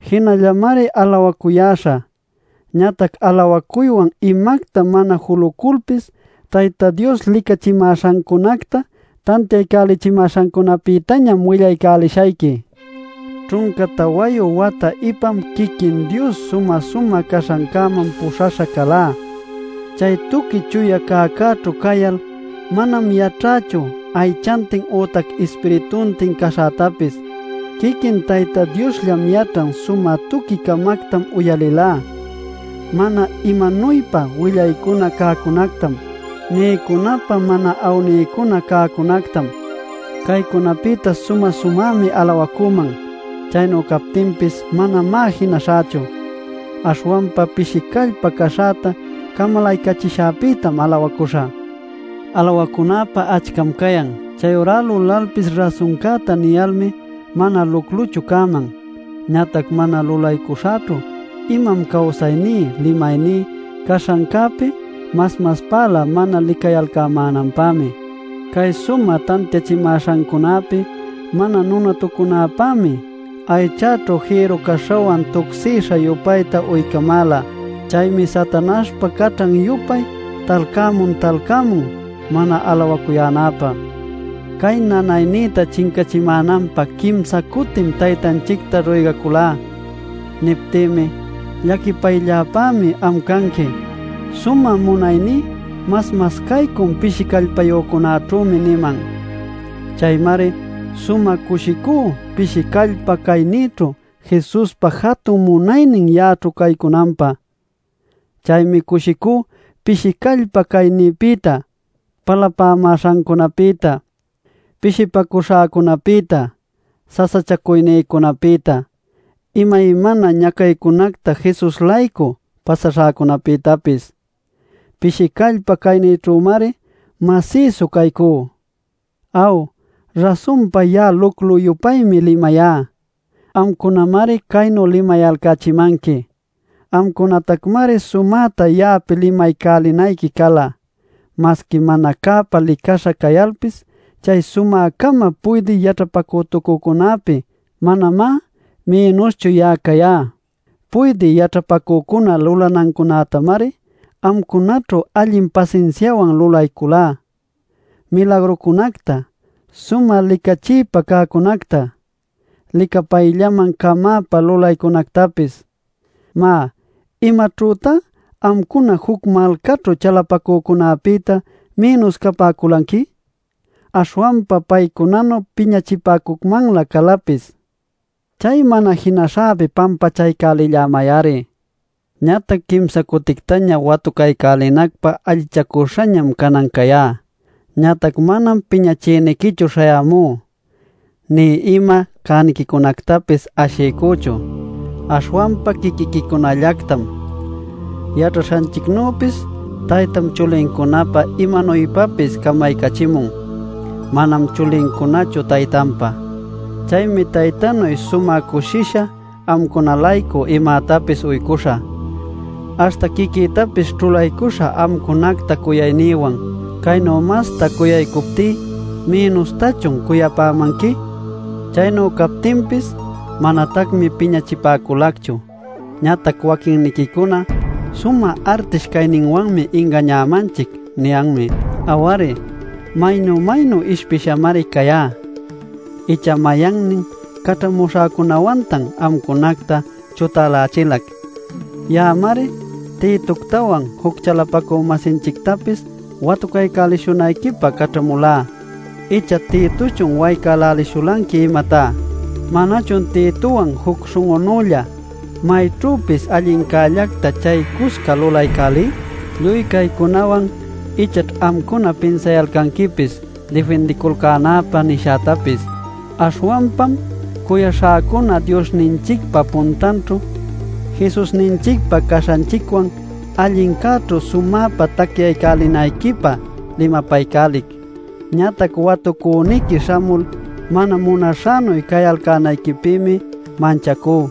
Jinallamari alawacuyäśhä. Ñatac alawacuywan imacta mana juluculpis, Tayta Dios licachimäśhancunacta tantiaycachimäśhancunapïtañam willaycälishayqui. Ćhunca tawayu wata ipam quiquin Dios sumä-sumä caśhancäman puśhaśha calá. Chay tuqui chuya cäcäćhu cayal — manam yaćhächu aychantin ütac ispirituntin caśhätapis; quiquin Tayta Diosllam yaćhan — sumä tuqui-camactam uyalilá, mana imanuypa willaycuna cäcunactam, niycunäpä mana awniycuna cäcunactam. Caycunapïta sumä-sumämi alawacüman. Chaynu captinpis manamá jinaśhächu. Aśhwanpa pishi callpa caśhäta camalaycachishäpïtam alawacuśhä. Alawacunäpä achcam cayan. Chayurá lulalpis rasuncäta niyalmi mana lucluchu cäman. Ñatac mana lulaycuśhächu imam cawsayní limayní caśhancäpi mas maspälä mana licayalcämänanpämi. Cay sumä tantiachimäśhancunapi mana nunatucunäpämi aychäćhu jïru-caśhawan tucsisha-yupayta uycämäla. Chaymi Satanaśhpa caćhan-yupay talcämun talcämun mana alawacuyänäpä. Cay nanaynïta chincachimänanpä quimsa cutim Taytanchicta ruygaculá. Niptïmi: “Llaquipaylläpämi am canqui. Sumä munayní mas-mas caycun pishi callpayücunäćhümi” niman. Chaymari sumä cushicú pishi callpa caynïćhu Jesuspa jatun munaynin ya'aćhu caycunanpä. Chaymi cushicú pishi callpa caynïpïta, palapämäśhancunapïta, pishipacuśhäcunapïta, sasachacuynïcunapïta, imaymana ñacaycunacta Jesus-laycu pasaśhäcunapïtapis. Pishi callpa caynïćhümari masïsu caycú. Aw, rasunpa ya'a luclu-yupaymi limayá; amcunamari caynu limayalcächimanqui. Amcunatacmari sumäta ya'api limaycälinayqui cala. Masqui mana cäpä licaśha cayalpis, chay sumä-cama puydï yaćhapacütucücunäpi manamá mïnuschu ya'a cayá. Puydï yaćhapacücuna lulanancunätamari amcunaćhu allin pasinsiawan lulayculá: milagrucunacta, sumä licachiypa cäcunacta, licapayllaman-camäpa lulaycunactapis. Má ¿imaćhütá amcuna juc malcaćhu chalapacücunapïta mïnus capäculanqui? Aśhwanpa paycunanu piñachipäcucmanlä calapis. ¡Chay mana jinaśhäpi pampachaycälimay-ari! Ñatac quimsa cutictaña watucaycälinacpä allichacüśhañam canan cayá. Ñatac manam piñachïniquichu śhayämú, nï ima cäniquicunactapis ashiycüchu, aśhwanpa quiquiquicunallactam. Yaćhaśhanchicnüpis taytam chulincunapä imanuypapis camaycachimun; manam chulincunachu taytanpá. Chaymi taytanuy sumä cushisha amcuna-laycu imätapis uycuśhä, aśhta quiquïtapis ćhulaycuśhä amcunacta cuyaynïwan. Caynu masta cuyaycuptí, ¿mïnustachun cuyapämanqui? Chaynu captinpis, manatacmi piñachipäculacchu. Ñatac waquinniquicuna “Sumä artish cayninwanmi ingañämanchic” niyanmi. Aw-ari, ¡maynu maynu ishpishamari cayá! ¿Icha mayannin caćhamuśhäcunawantan amcunacta chutälächilac? Ya'amari Titoctawan juc chalapacü-masinchictapis watucaycälishunayquipä caćhamulá. ¿Icha Titochun waycälälishulanqui imatá? ¿Manachun Titowan juc śhun'unülla mayćhüpis allincällacta chaycusca lulaycälí? Lluy caycunawan ichaćh amcuna pinsayalcanquipis difindiculcänäpä nishätapis. Aśhwanpam cuyaśhäcuna Diosninchicpa puntanćhu Jesusninchicpa caśhanchicwan allincäćhu sumäpa tacyaycälinayquipä limapaycälic. Ñatac watucüniqui śhamul mana munaśhänuy cayalcänayquipïmi manchacú.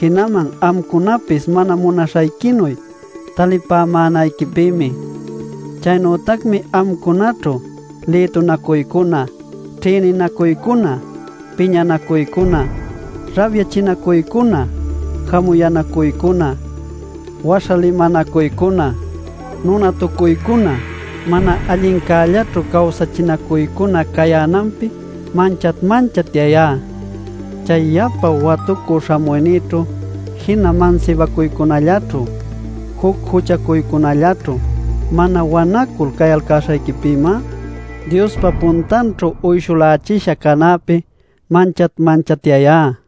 Jinaman amcunapis mana munaśhayquinuy talipämänayquipïmi. Chaynütacmi amcunaćhu lïtunacuycuna, ćhïninacuycuna, piñanacuycuna, rabyachinacuycuna, jamuyänacuycuna, waśha limanacuycuna, nunatucuycuna, mana allincällaćhu cawsachinacuycuna cayänanpi manchat-manchatyayá. Chay yapa watucü śhamuynïćhu jina mansibacuycunallaćhu, juc juchacunallaćhu mana wanacul cayalcäśhayquipïmá, Diospa puntanćhu uyshulächisha canäpi manchat-manchatyayá.